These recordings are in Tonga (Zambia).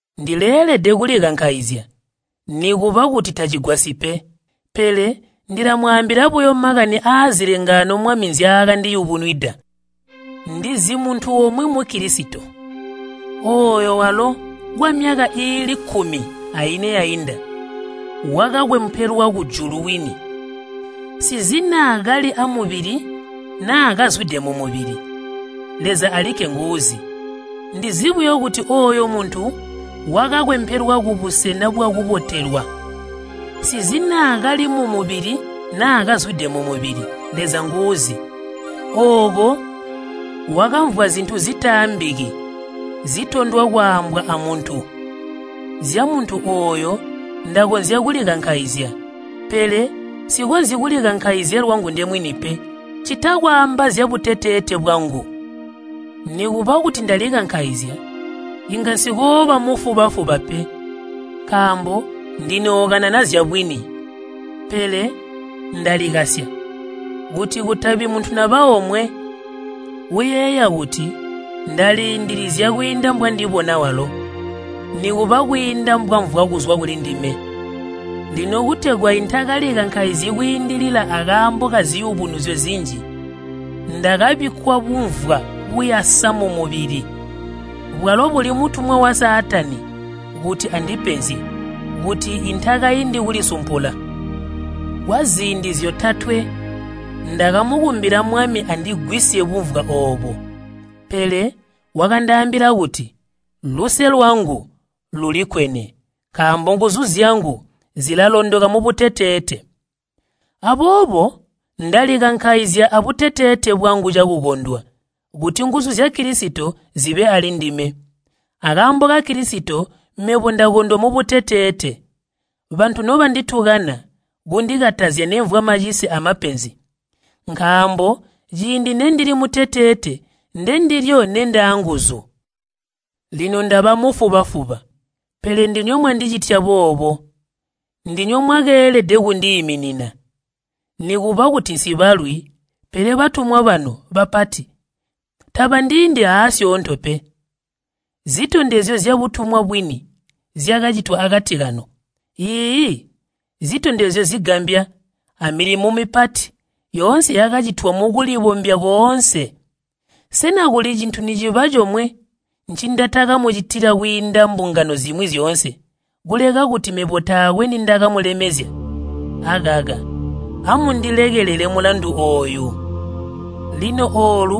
Ndileelede kulikankaizya, nikuba kuti tacigwasyi pe, pele ndilamwaambila buyo makani aazilengaano Mwami nzyaakandiyubunwida. Ndizi muntu umwi Mukilisito, ooyo walo kwamyaka iili kkumi aine yainda wakakwempelwa kujulu kwini. Nsizi naa kali amubili naa kazwide mumubili, Leza alikke nguuzi. Ndizi buyo kuti ooyo muntu wakakwempelwa kubusena bwakubotelwa. Nsizi naa kali mumubili naa kazwide mumubili, Leza nguuzi. Ooko wakamvwa zintu zitaambiki zitondwa kwaambwa aa muntu. Zyamuntu ooyo ndakonzya kulikankaizya, pele nsikonzyi kulikankaizya lwangu ndemwini pe, ccita kwaamba zyabuteteete bwangu. Nikuba kuti ndalikankaizya, inga nsikooba mufuba-fuba pe, nkaambo ndinookanana zyabwini. Pele ndalikasya, kuti kutabi muntu naba omwe uyeeya kuti ndaliindilizya kwiinda mbwandibona walo, nikuba kwiinda mbwamvwa kuzwa kulindime. Lino kutegwa intalikankaizyi kwiindilila akaambo kaziyubunuzyo zinji, ndakabikkwa bumvwa buyasa mumubili, bwalo buli mutumwa wa Saatani kuti andipenzye, kuti intakaindi kulisumpula. Kwaziindi zyotatwe ndakamukumbila Mwami andigwisye bumvwa oobo. Pele wakandaambila kuti, “Luse lwangu lulikkwene, nkaambo nguzu zyangu zilalondoka mubuteteete.” Aboobo ndalikankaizya abuteteete bwangu cakukondwa, kuti nguzu zya Kilisito zibe alindime. Akaambo ka Kilisito, mebo ndakondwa mubuteteete, bantu nobanditukana, kundikatazya nemvwa macise amapenzi. Nkaambo ciindi nendili muteteete, ndendilyo nendaanguzu. Lino ndaba mufuba-fuba! Pele ndinywe mwandicitya boobo. Ndinywe mwakeelede kundiiminina. Nikuba kuti nsibalwi, pele batumwa banu bapati tabandiindi aasyoonto pe. Zitondezyo zyabutumwa bwini zyakacitwa akati kanu. Iiyi, zitondezyo zigambya, amilimo mipati yoonse yakacitwa mukulibombya koonse. Sena kuli cintu niciba comwe ncindatakamucitila kwiinda mbungano zimwi zyoonse, kuleka kuti mebo taakwe nindakamulemezya? Akaka, amundilekelele mulandu ooyu! Lino oolu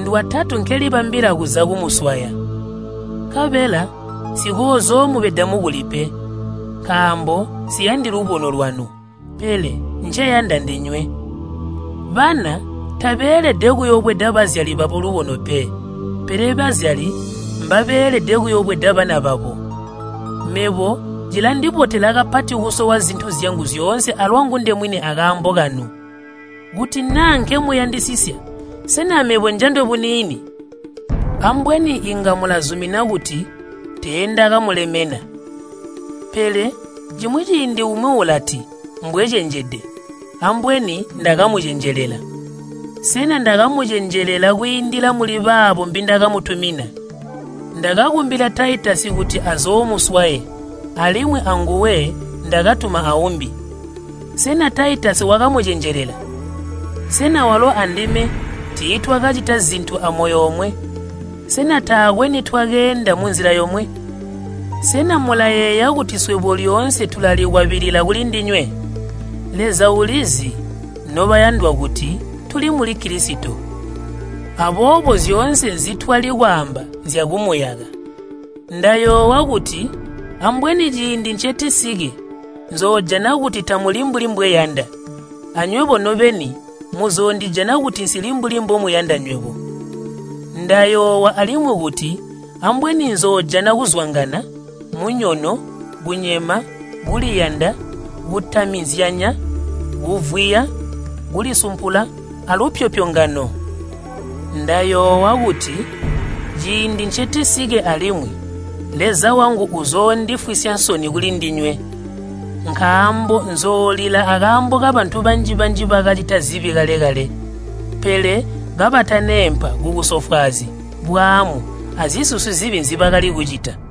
ndwatatu nkelibambila kuza kumuswaya. Nkabela nsikoozoomubeda mukuli pe, nkaambo nsiyandi lubono lwanu, pele nceyanda ndinywe. Bana tabeelede kuyobweda bazyali babo lubono pe, pele bazyali mbabeelede kuyobweda bana babo. Mebo cilandibotela kapati kusowa zintu zyangu zyoonse alwangu ndemwini akaambo kanu. Kuti naa nkemuyandisisya, sena mebo njandwe buniini? Ambweni inga mulazumina kuti teendakamulemena. Pele cimwi ciindi umwi ulati mbwecenjede, ambweni ndakamucenjelela. Sena ndakamucenjelela kwiindila muli baabo mbindakamutumina? Ndakakumbila Taitasi kuti azoomuswaye, alimwi anguwe ndakatuma aumbi. Sena Taitasi wakamucenjelela? Sena walo andime tiitwakacita zintu amoyo omwe? Sena taakwe nitwakeenda munzila yomwe? Sena mulayeeya kuti swebo lyoonse tulalikwabilila kulindinywe? Leza ulizi, nobayandwa kuti tuli muli Kilisito, aboobo zyoonse nzitwali kwaamba nzyakumuyaka. Ndayoowa kuti ambweni ciindi ncetisike nzoojana kuti tamuli mbuli mbweyanda, anywebo nobeni muzoondijana kuti nsili mbuli mbomuyanda nywebo. Ndayoowa alimwi kuti ambweni nzoojana kuzwangana, munyono, kunyema, kuliyanda, kutamizyanya, kuvwiya, kulisumpula alupyopyongano. Ndayoowa kuti ciindi ncetisike alimwi Leza wangu uzoondifwisya nsoni kulindinywe, nkaambo nzoolila akaambo kabantu banji-banji bakacita zibi kale-kale, pele kabataneempa kubusofwaazi, bwaamu, azisusi zibi nzibakali kucita.